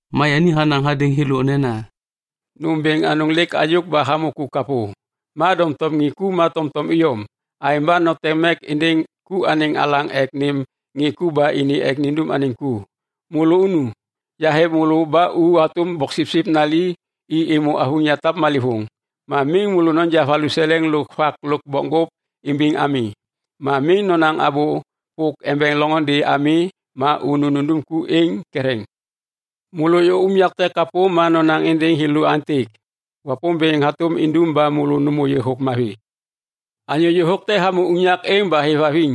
Ma yani hanaŋ hadêŋ thêlô nena, “Nôm bêŋ anôŋ lêk hayôk ba hamô ku kapô, ma doŋtom ŋê ku ma tomtom iyom. Aêŋ ba noteŋ mek êndêŋ ku anêŋ alaŋ ek nêm ŋê ku ba ini ek nindum anêŋ ku. Môlô nu. Yahêv môlô ba u hatôm boksipsip nali i êmô avuŋ yatap malêvôŋ. Ma miŋ môlô noja valuseleŋ lôk vak lôk bokŋgôp imbiŋ ami. Ma miŋ nonaŋ abô pôk embeŋ loŋôndê ami ma unu nundum ku êŋ ketheŋ. “Môlô ôyô unyak te kapô, ma nonaŋ êndêŋ thêlô aêntêk, ‘Wapômbêŋ hatôm indum ba môlô nômô yôhôk mavi.’ Anyô yôhôk te hamô unyak êŋ ba hêvhaviŋ,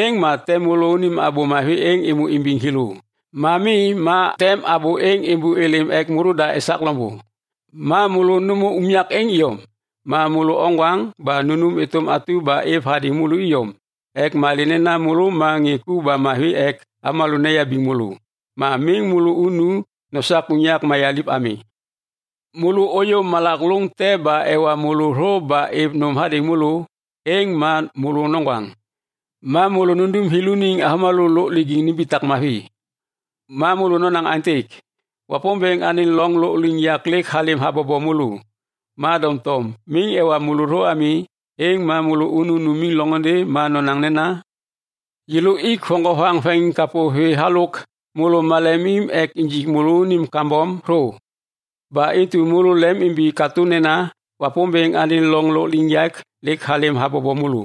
êŋ ma tem môlônim abô mavi êŋ êmô imbiŋ thêlô. Ma mi, ma tem abô êŋ êmbôlêm ek môlôda esak loŋbô. Ma môlô nômô unyak êŋ iyom. Ma môlô oŋgwaŋ ba nunum êtôm atu ba êv hadêŋ môlô iyom ek malê nena môlô ma ŋê ku ba mavi ek avômalô neyabiŋ môlô. Ma miŋ môlô unu nosak unyak mayaliv ami. “Môlô ôyô malak lôŋ te ba ewa môlô thô ba êv nôm hadêŋ môlô, êŋ ma môlôŋgaŋ. Ma môlô nundum thêlôniŋ avômalô lôk lijiŋ nimbitak mavi, ma môlô nonaŋ aêntêk, ‘Wapômbêŋ anêŋ loŋ lôkliŋyak lêk halêm habobo môlô.’ Ma doŋtom miŋ ewa môlô thô ami, êŋ ma môlô unu numiŋ loŋôndê ma nonaŋ nena, ‘Yêlô ik voŋgovaŋ veŋiŋkapô vê halôk môlô malemim ek injik môlônim kambom thô. Ba intu môlô lemim imbi katô nena Wapômbêŋ anêŋ loŋ lôkliŋyak lêk halêm habobo môlô.’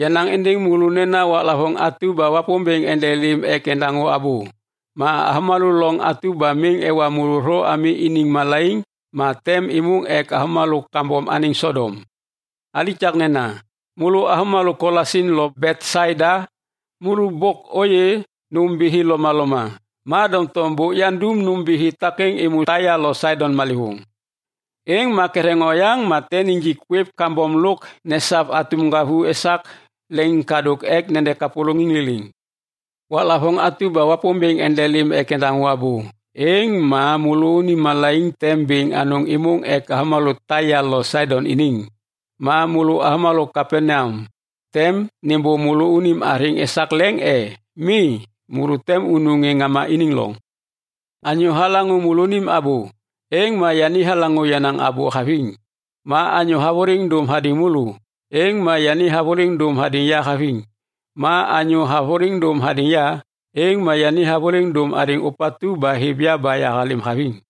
Yanaŋ êndêŋ môlô nena waklavôŋ atu ba Wapômbêŋ endelêm ek endaŋô abô, êŋ ma avômalô loŋ atu ba miŋ ewa môlô thô ami, thêlôniŋ malaiŋ tem êmôŋ ek avômalô kambom anêŋ Sodom. “Alikaknena, môlô avômalô Kolasin lo Betsaida! Môlô bôk ôyê nômbithi lomaloma. Ma doŋtom bôk yandum nômbithi takêŋ êmô Taia lo Saidon malêvôŋ, êŋ ma ketheŋ oyaŋ ma tem nijik kwêv kambom lôk nesav atum ŋgavu esak leŋiŋkadôk ek nede kapôlôŋiŋ liliŋ. Waklavôŋ atu ba Wapômbêŋ endelêm ek endaŋô abô, êŋ ma môlônim malaiŋ tem bêŋ anôŋ êmôŋ ek avômalô Taia lo Saidon iniŋ! Ma môlô avômalô Kapaneam, tem nêmbô môlônim athêŋ esak leŋ e? Mi, môlô tem unu ŋê ŋama iniŋ loŋ! “Anyô halaŋô môlônim abô, êŋ ma yani halaŋô yenaŋ abô haviŋ. Ma anyô havôliŋ dôm hadêŋ môlô, êŋ ma yani havôliŋ dôm hadêŋ ya haviŋ. Ma anyô havôliŋ dôm hadêŋ ya, êŋ ma yani havôliŋ dôm hadêŋ Ôpatu ba hêv ya ba yahalêm haviŋ.”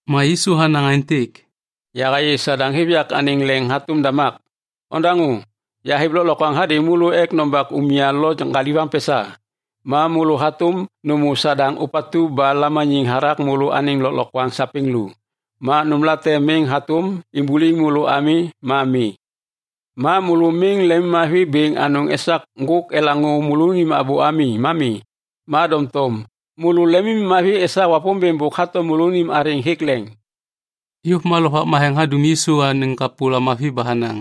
Ma Yisu hanaŋ aêntêk, “Yahayê Sadaŋ hêv yak anêŋ leŋ hatôm damak. Odaŋô, yahêv lôklokwaŋ hadêŋ môlô ek nombak umya lo daŋgaviŋ pesa. Ma môlô hatôm nômô Sadaŋ ôpatu ba lamaniŋ hathak môlô anêŋ lôklokwaŋ sapêŋ lu. Ma nômlate miŋ hatôm imbuliŋ môlô ami ma mi. Ma môlô miŋ lemimmavi bêŋ anôŋ esak ŋgôk elaŋô môlônim abô ami ma mi, ma doŋtom môlô lemimmavi esak Wapômbêŋ bôk hato môlônim athêŋ hêk leŋ.” Yôv ma Lovak Matheŋ hadum Yisu anêŋ kapô lamavi ba hanaŋ,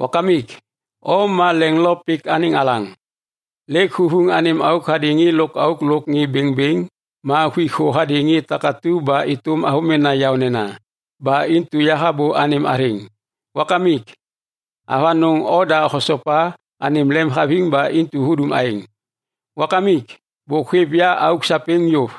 “Wakamik, O ma leŋ lo pik anêŋ alaŋ! Lêk huvuŋ anêm auk hadêŋ ŋê lôkauk lôk ŋê bêŋbêŋ ma huik thô hadêŋ ŋê takatu ba êtôm avômena yaônena. Ba intu yahabô anêm athêŋ! Wakamik, avanôŋ oda hosopa anêm lemhaviŋ ba intu hudum aêŋ. “Wakamik bôk hôêv ya auk sapêŋ yôv.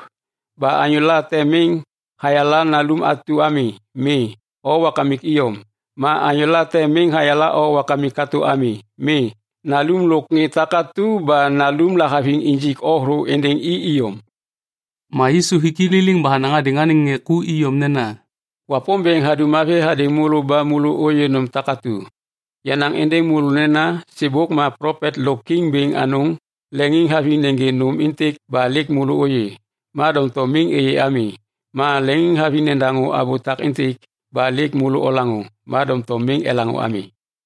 Ba anyô late miŋ hayala Nalum atu ami. Mi, O Wakamik iyom. Ma anyô late miŋ hayala O Wakamik katô ami. Mi, Nalum lôk ŋê takatu ba Nalum lahaviŋ injik O thô êndêŋ i iyom.” Ma Yisu hik i liliŋ ba hanaŋ hadêŋ anêŋ ŋê ku iyom nena, “Wapômbêŋ hadum mavi hadêŋ môlô ba môlô ôyê nôm takatu. Yanaŋ êndêŋ môlô nena sêbôk ma plopet lôk kiŋ bêŋ anôŋ leŋiŋhaviŋ nêgê nôm êntêk ba lêk môlô ôyê, ma doŋtom miŋ êyê ami. Ma leŋiŋhaviŋ nedaŋô abô takêntêk ba lêk môlô olaŋô, ma doŋtom miŋ elaŋô ami.”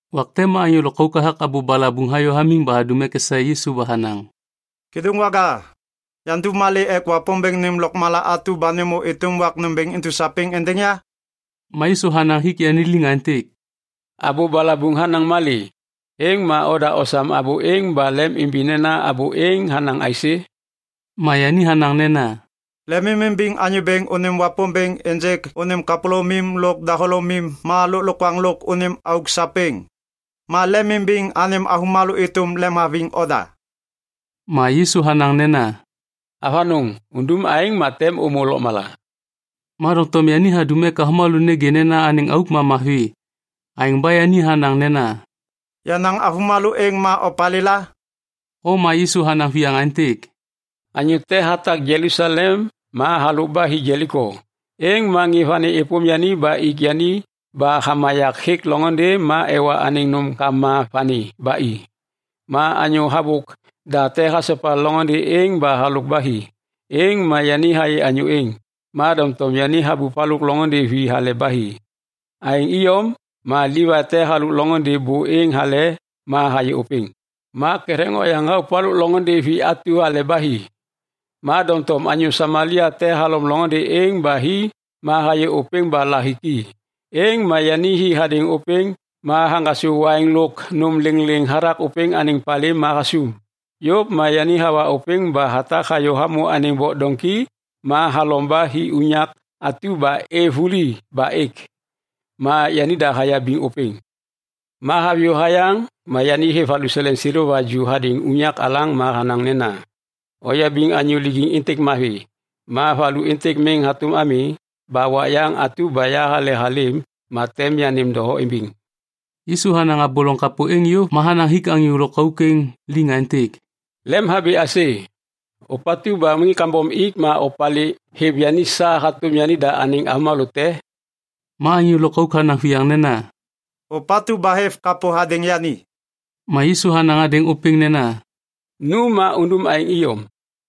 Wak te ma anyô lôkauk hathak abô balabuŋ hayô hamiŋ ba hadum ek esaê Yisu ba hanaŋ, “Kêdôŋwaga, yandum malê ek Wapômbêŋ nêm lôkmala atu ba nêmô êtôm wak nômbêŋ intu sapêŋ êndêŋ ya?” Ma Yisu hanaŋ hik yani liŋ aêntêk, “Abô balabuŋ hanaŋ malê? Êŋ ma oda osam abô êŋ ba lemimbi nena abô êŋ hanaŋ aisê?” Ma yani hanaŋ nena, “Lemimimbiŋ Anyô Bêŋ unim Wapômbêŋ ênjêk unim kapôlômim lôk dahôlômim ma lôklokwaŋ lôk unim auk sapêŋ. Ma lemimbiŋ anêm avômalô êtôm lemhaviŋ oda.” Ma Yisu hanaŋ nena, “Avanôŋ. Undum aêŋ ma tem ômô lôkmala.” Ma doŋtom yani hadum ek avômalô nêgê nena anêŋ auk ma mavi, aêŋ ba yani hanaŋ nena, “Yenaŋ avômalô êŋ ma opalêla?” Ma Yisu hanaŋ viyaŋ aêntêk, “Anyô te hatak Jelusalem ma halôk ba hi Jeliko. Êŋ ma ŋê vani êpôm yani ba ik yani ba hamayak hêk loŋôndê ma ewa anêŋ nômkama vani ba i. Ma anyô habôk da te hasopa loŋôndê êŋ ba halôk ba hi. Êŋ ma yani hayê anyô êŋ, ma doŋtom yani habup halôk loŋôndê vi hale ba hi. Aêŋ iyom ma Livai te halôk loŋôndê bô êŋ hale ma hayê ôpêŋ, ma ketheŋ oyaŋ habup halôk loŋôndê vi atu hale ba hi. Ma doŋtom anyô Samalia te halom loŋôndê êŋ ba hi ma hayê ôpêŋ ba lahiki. Êŋ ma yani hi hadêŋ ôpêŋ ma haŋgasô waiŋ lôk nôm lêŋlêŋ hathak ôpêŋ anêŋ palê ma hasum. Yôv ma yani hawa ôpêŋ ba hatak hayô hamô anêŋ bok doŋki ma halom ba hi unyak atu ba êv vuli ba êk. Ma yanida hayabiŋ ôpêŋ. Ma haviyô hayaŋ ma yani hêv valuseleŋ seleva ju hadêŋ unyak alaŋ ma hanaŋ nena, ‘Oyabiŋ anyô lijiŋ êntêk mavi. Ma valu êntêk miŋ hatôm ami ba wak yaŋ atu ba yahalehalêm ma tem yanêm doho imbiŋ.’” Yisu hanaŋ abô loŋ kapô êŋ yôv ma hanaŋ hik anyô lôkauk êŋ liŋ aêntêk, “Lemhabi aisê? Ôpatu ba ŋê kambom ik ma opalê hêv yani sa hatôm yanida anêŋ avômalô te?” Ma anyô lôkauk hanaŋ viyaŋ nena, “Ôpatu ba hêv kapô hadêŋ yani.” Ma Yisu hanaŋ hadêŋ ôpêŋ nena, “Nu ma undum aêŋ iyom.”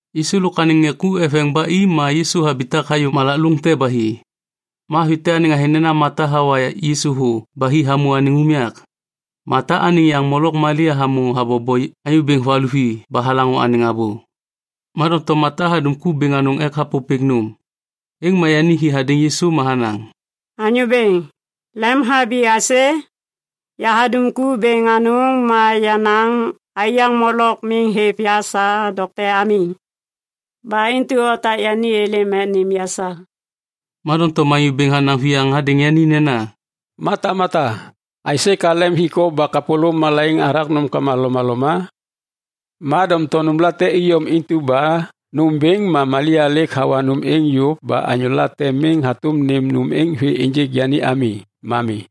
Yisu lôk anêŋ ŋê ku eveŋ ba i ma Yisu habitak hayô malak lôŋ te ba hi. Ma avi te anêŋ athêŋ nena Mata hawa Yisu thô ba hi hamô anêŋ unyak. Mata anêŋ yaŋ molok Malia hamô habobo Anyô Bêŋ valuvi ba halaŋô anêŋ abô. Ma doŋtom Mata hadum ku bêŋ anôŋ ek hapôpêk nôm. Êŋ ma yani hi hadêŋ Yisu ma hanaŋ, “Anyô Bêŋ, lemhabi aisê? Yahadum ku bêŋ anôŋ ma yenaŋ aiyaŋ molok miŋ hêv ya sa dokte ami. Ba intu otak yani êlêm ek nêm ya sa.” Ma doŋtom Anyô Bêŋ hanaŋ viyaŋ hadêŋ yani nena, “Mata, Mata, aisê ka lem hik o ba kapôlôm malaiŋ hathak nômkama lomaloma? Ma doŋtom nômlate iyom intu ba nômbêŋ ma Malia lêk hawa nôm êŋ yôv ba anyô te miŋ hatôm enja nôm êŋ vê ênjêk yani ami ma mi.”